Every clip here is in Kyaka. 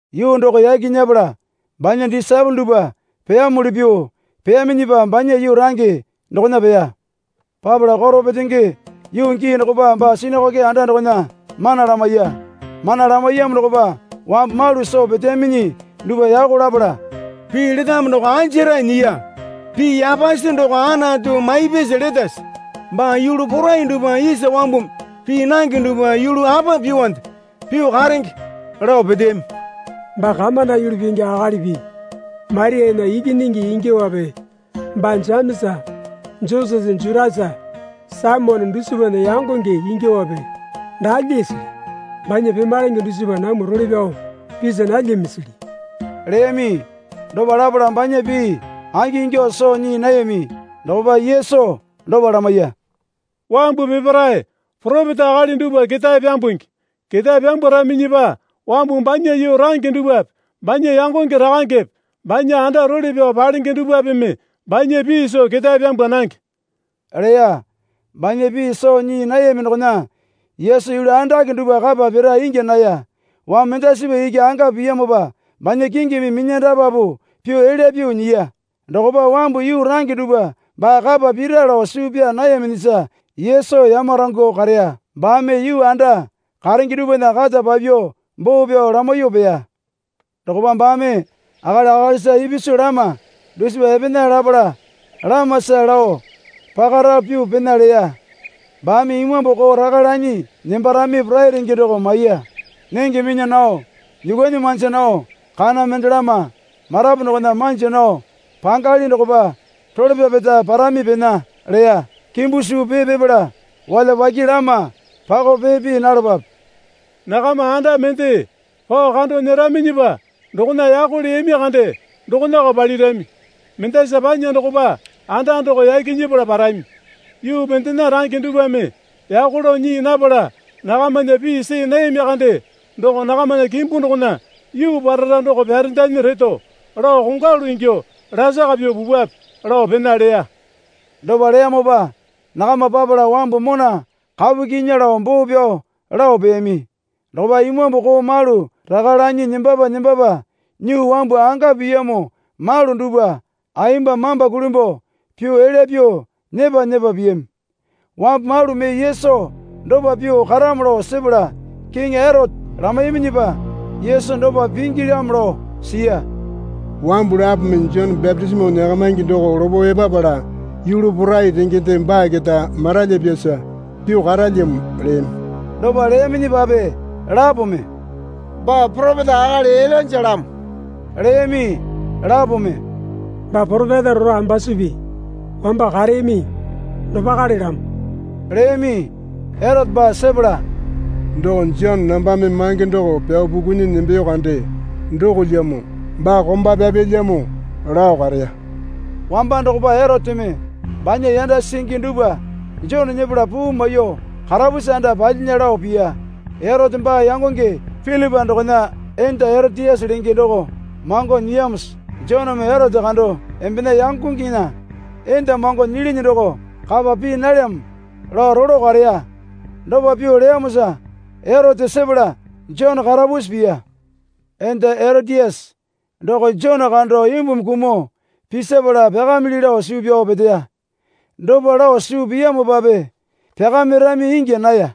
Yuu doko yaki nyepala banya disaepole dupwa peyamuli pyuo peyaminyipa banya yuu range dokona peya. Papala koro petenge yuu gii dokopa baa sinakoke anda dokona mana lamaiya. Mana lamaiyamo dokopa wambu malu soo peteyaminyi dupwa yako lapala, Pii letamo doko anjarae nyiya? Pii yapasi doko Anatu maipyasa letase? Baa yulu porai dupwa isa wambumi pii nange dupwa yulu apa pyuonde pyuo karenge? lao peteyami. Baa kamonda yulu pingi akalipi Mariana ikinyingi ingyuowape baa Jemesa Josese Jutasa Saimone dusipana yangonge ingyuowape daa lyasili? Banya pemalenge dusipa namwa role pyao pisa nalyamisili? leyami. Dopa lapala banya pii angingyuo soo nyii nayami. Dokopa Yesu dopa lamaiya. Wambu peparae poropeta akali dupwa ketae pyambungi. Ketae pyambwaraminyipa wambu banya yuu range dupwape banya yangonge rakangepe banya anda role pyao palenge dupwapeme banya pii soo ketae pyambwa nange, leya. Banya pii soo nyii nayami dokona Yesu yulu andake dupwa kapa pira ingya naya. Wambu mendasipa iki anga piyamopa banya kingimi minyandapapu pyuo elya pyuo nyiya. Dokopa wambu yuu range dupwa baa kapa pira lao suu pyaa nayaminyisa Yesu yamarangyuo kareya. Baame yuu anda karenge dupwana kata papyuo boo pyao lamaiyuo peya. Dokopa baame akali akalisa ipisu lama dusipa epena lapala lamasa lao pakarapu pyuo pena leya. Baame imambu koo raka lanyi nembarami porai renge doko maiya. Nenge minya nao nyuukwuanyi manja nao kana mendelama marapu dokona manja nao pangali dokopa role pyapeta parami pena, leya. Kimbu suu pee pipala walyapake lama pakao pee pii nalapape. Nakama anda mende pao kando nyeraminyipa dokona yako leyami kande dokonako palirami. Mendasa panya dokopa anda doko yaki nyepala parami. Yuu mendena range dupwame yako lao nyii napala nakamana pii soo nayami kande doko nakamana kimbu dokona yuu parara doko pyarendanyi reto lao kongwalu ingyuo lasaka pyuo pupwape, lao pena leya. Dopa leyamopa nakama papala wambu mona kapu kyinya lao boo pyao lao peyami. Dokopa imambu koo malu raka lanyi nembapa nembapa nyuo wambu anga piyamo malu dupwa ayemba mamba kulimbuo pyuo elya pyuo nyepa nyepa piyami. Wambu malu mee Yesu dopa pyuo karamo lao sepala Kiŋi Erote lamaiyaminyipa Yesu dopa pingilyamo lao siya. Wambu lapome Jone bapitisimo nyakamaingi doko lopo epapala yulu porai rengende baa keta maralyipyasa pyuo karalyamo, leyami. Dopa leyaminyipape lapome, Baa poropeta akali Ilainjalamo, leyami. Lapome, Baa poropeta rora ambasupi wamba kareyami dopakalelamo, leyami. Erote baa sepala, Doko Jone nambame mange doko pyao pukunyi nembeyo kande dokolyamo. Baa komba pyapyalyamo, lao kareya. Wamba dokopa Eroteme banya yanda singi dupwa Jone nyepala puu maiyuo karapusi anda palyinya, lao piya. Erote baa yangonge Pilipa dokona enda Eroteyase lenge doko mango nyiyamosa Joneme Erote kando, Embena yangongena enda mango nyilinyi doko kapa pii nalyamo, lao rolo kareya. (Dopa pyuo leyamosa Erote sepala Jone karapusi piya.) Enda Eroteyase doko Jone kando imbumi kumuo pisipala pyakamili lao suu pyao peteya. Dopa lao suu piyamopape pyakamirami ingya naya.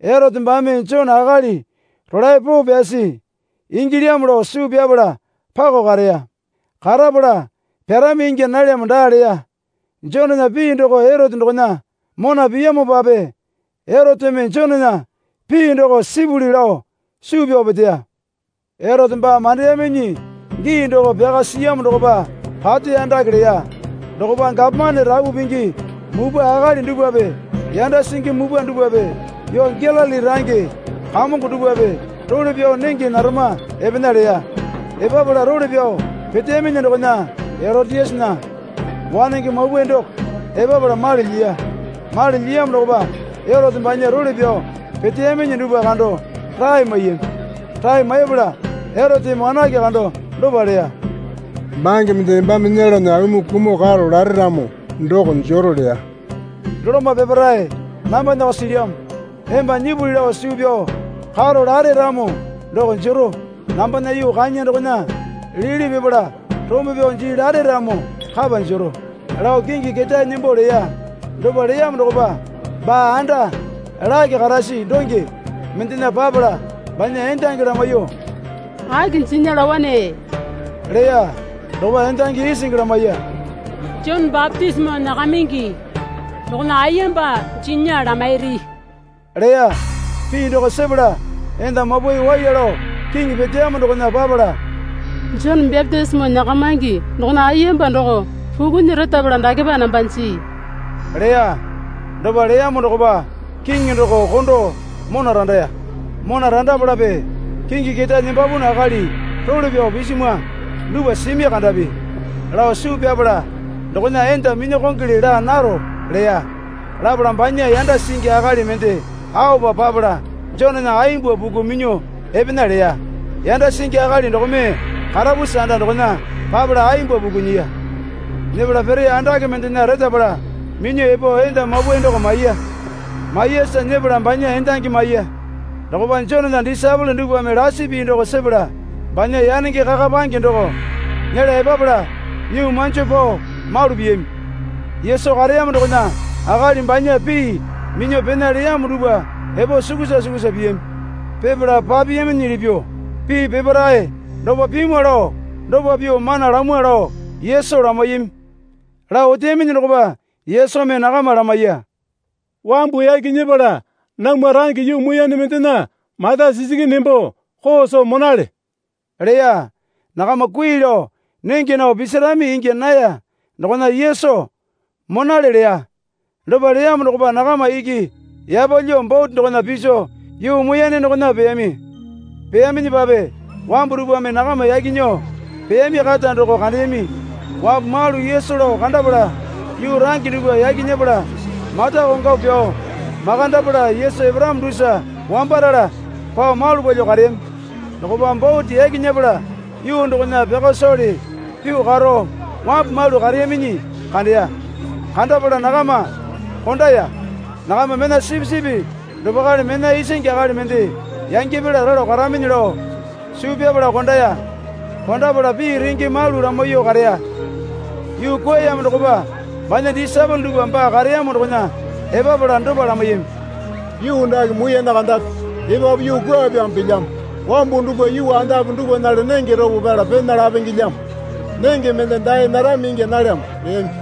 Erote baame Jone akali rolae poo pyasi ingilyamo lao suu pyapala pako kareya. Karapala pyarami ingya nalyamo daa leya. Jonena pii doko Erote dokona mona piyamopape Eroteme Jonena pii doko sipuli lao suu pyao peteya. Erote baa mandeyaminyi gii doko pyaka siyamo dokopa pati andake leya. Dokopa, Gapomane rapu pingi mupwa akali dupwape yanda singi mupwa dupwape yuu Galili range kamongo dupwape role pyao nenge narama epena, leya. Epapala role pyao peteyaminyi dokona Eroteyasena wanenge mapwae doko epapala mali lyiya. Mali lyiyamo dokopa Erote banya role pyao peteyaminyi dupwa kando rae maiyami. Rae maipala Eroteme wanake kando dopa leya. Bange mende embame nyelana aumi kumuo karo lare ramo doko jero, leya. Doloma peparae nambanako silyamo emba nyipuli lao suu pyao karo lare ramo doko jero. Nambana yuu kanya dokona lili pipala rombo pyao jii lare ramo kapa jero, lao kingi ketae nembo leya. Dopa leyamo dokopa baa anda lake karasi donge mendena papala banya endangi lamaiyuo, Aki jinya laowane? leya. Dokopa endangi isingi lamaiya. Jone bapitisimo nyakamingi dokona ayemba jinya lamairi, leya. Pii doko sepala enda mapwae waiya lao kiŋi peteyamo dokona papala, Jone bapitisimo nyakamingi dokona ayemba doko pukunyi retapala dakepa namba jii, leya. Dopa leyamo dokopa kiŋi doko kondo mona randaya. Mona randapalape kingi ketae nembapunu akali role pyao pisimwa dupwa simi kandapi lao suu pyapala dokona enda minyakongole laa naro, leya. Lapala banya yanda singi akali mende aopa papala Jonena ayemba puku minyuo epena leya. Yanda singi akali dokome karapusi anda dokona papala ayemba puku nyiya. Nyepala piri andake mendena retapala minyuo epo enda mapwae doko maiya. Maiyasa nyepala banya endangi maiya. Dokopa Jonena disaepole dupwame lasi pii doko sepala banya yanenge kakapange doko nyela epapala nyuo manjo pao malu piyami. Yesu kareyamo dokona akali banya pii minyuo pena leyamo dupwa epo sukusa sukusa piyami. Pipala papiyaminyili pyuo pii peparae dopa pimwa lao dopa pyuo mana lamwa lao Yesu lamaiyami. Lao oteyaminyi dokopa Yesumi nakama lamaiya. Wambu yaki nyepala namwa range yuu muiyane mendena mata sikinyi nembo koo soo monale, leya. Nakama kui lao nenge nao pisirami ingya naya dokona Yesu, Monale, leya. Dopa leyamo dokopa nakama iki yapalyuo bote dokona piso yuu muiyane dokona peyami. Peyaminyipape wambu dupwame nakama yaki nyuo peyami kata doko kandeyami. Wambu malu Yesu lao kandapala yuu range dupwa yaki nyepala mata kongwapu pyao makandapala Yesu eparamo dusa wambarala pao malu palyuo kareyami. Dokopa bote yaki nyepala yuu dokona pyaka sowale pyuo karo wambu malu kareyaminyi kandeya. Kandapala nakama kondaya. Nakama mena sipisipi dopakale mena isingi akali mende yangyapala ralo karaminyi lao suu pyapala kondaya. Kondapala pii renge malu lamaiyuo kareya. Yuu kwuayamo dokopa banya disaepole dupwa baa kareyamo dokona epapala dopa lamaiyami. Yuu dake muiyane kandape. Epapu yuu kwuapyamo pilyamo. Wambu dupwa yuu andape dapwanale nenge ropo pyala pena lapengelyamo. Nenge mende dae narami ingya nalyamo, leyami.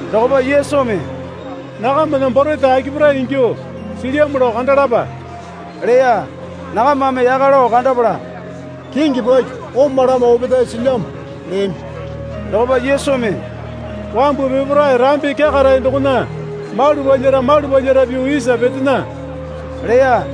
Dokopa Yesumi, Nakamana borete akipare ingyuo silyamo lao kandalapa, leya. Nakamame yaka lao kandapala, Kingi paki, oma lama opetae silyamo, leyami. Dokopa Yesumi, Wambu peparae rambi kyakarae dokona malu palyara malu palyara pyuo isa petena, leya.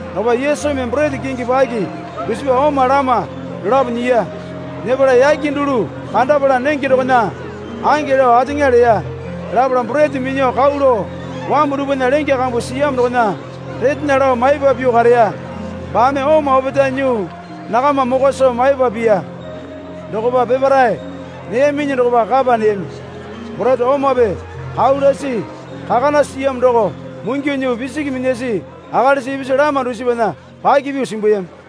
Dokopa Yesumi borete kingi paki dusipa oma lama dolapo nyiya. Nyepala yake dulu kandapala nenge dokona ange lao ateŋa leya. Lapala borete minyuo kau lao wambu dupwana lenge kambu siyamo dokona retena lao maipa pyuo kareya. Baame oma opetae nyuo nakama mokwa soo maipa piya. Dokopa peparae neyaminyi dokopa kapa neyami. Borete omape kau lasi kakana siyamo doko mungyuo nyuo pisiki minyasi akalisa ipisu lama dusipana paki pyuo simbuyami.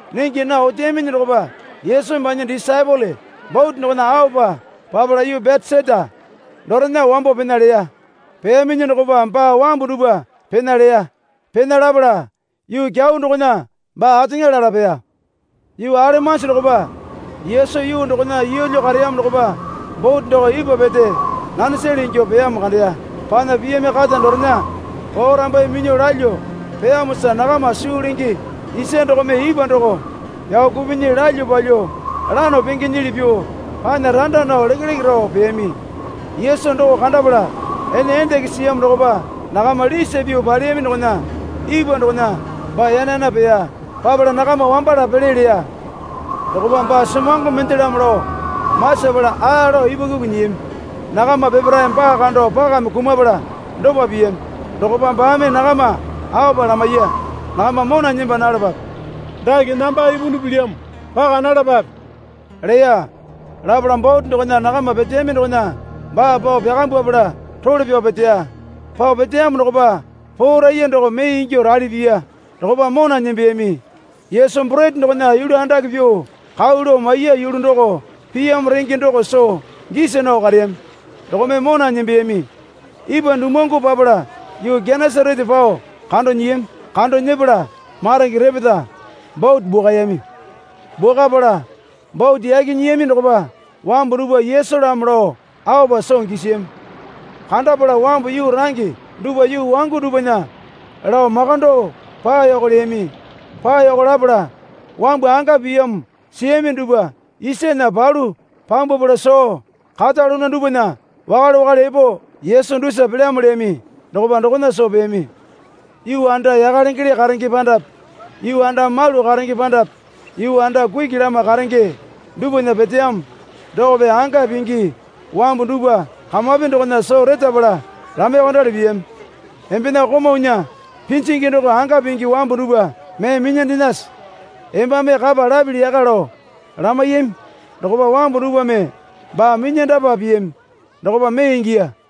Nenge nao oteyaminyi dokopa Yesumi banya disaepole bote dokona aopa papala yuu Betesaita dorena wambo pena leya. Peyaminyi dokopa baa wambu dupwa pena leya. Pena lapala yuu kyau dokona baa ateŋa lala peya. Yuu alemanji dokopa Yesu yuu dokona yeelyo kareyamo dokopa bote doko ipwa pete nanesale ingyuo peyamo kandeya. Panya piyami kata dorena porambaiye minyuo lalyuo peyamosa nakama suu lenge isa dokome ipwa doko pyao kupinyi lalyuo palyuo lano pengenyili pyuo panya randa nao lekeleke rao peyami. Yesu doko kandapala ene endenge siyamo dokopa nakama lisa pyuo paleyami dokona ipwa dokona baa yana yana peya. Papala nakama wambala pele leya. Dokopa baa semongo mendelamo lao masapala aa lao ipwakuku nyiyami. Nakama peparae baa kando pakame kumapala dopa piyami. Dokopa baame nakama aopa lamaiya. Nakama mona nemba nalapape, Dake namba ipunu pilyamo. Paka nalapape, leya. Lapala bote dokona nakama peteyami dokona baa pao pyakambwapala role pyao peteya. Pao peteyamo dokopa poraiya doko mee ingyuo rali piya. Dokopa mona nembeyami. Yesu borete dokona yulu andake pyuo kau lao maiya yulu doko piyamo renge doko soo gisa nao kareyami dokome mona nembeyami. Ipwa dumuwangu papala yuu Genesarete pao kando nyiyami. Kando nyepala maronge repeta bote bwakayami. Bwakapala bote yaki nyiyami dokopa wambu dupwa Yesulamo lao aopa soo gisiyami. Kandapala wambu yuu range dupwa yuu wangu dupwana lao makando paoyoko leyami. Paoyoko lapala wambu anga piyamo siyami dupwa isana palu pyambwapala soo kata luna dupwana wakale wakale epo Yesu dusa pelyamo leyami dokopa dokona soo peyami. Yuu anda yaka lengele karenge pandape yuu anda malu karenge pandape yuu anda kuki lama karenge dupwana peteyamo dokope anga pingi wambu dupwa kamapi dokona soo retapala lamaiyuokondali piyami. Embena komaunya pinjingi doko anga pingi wambu dupwa mee minyandenase. Embame kapa lapili yaka, lao lamaiyami. Dokopa wambu dupwame baa minyandapa piyami dokopa mee ingiya.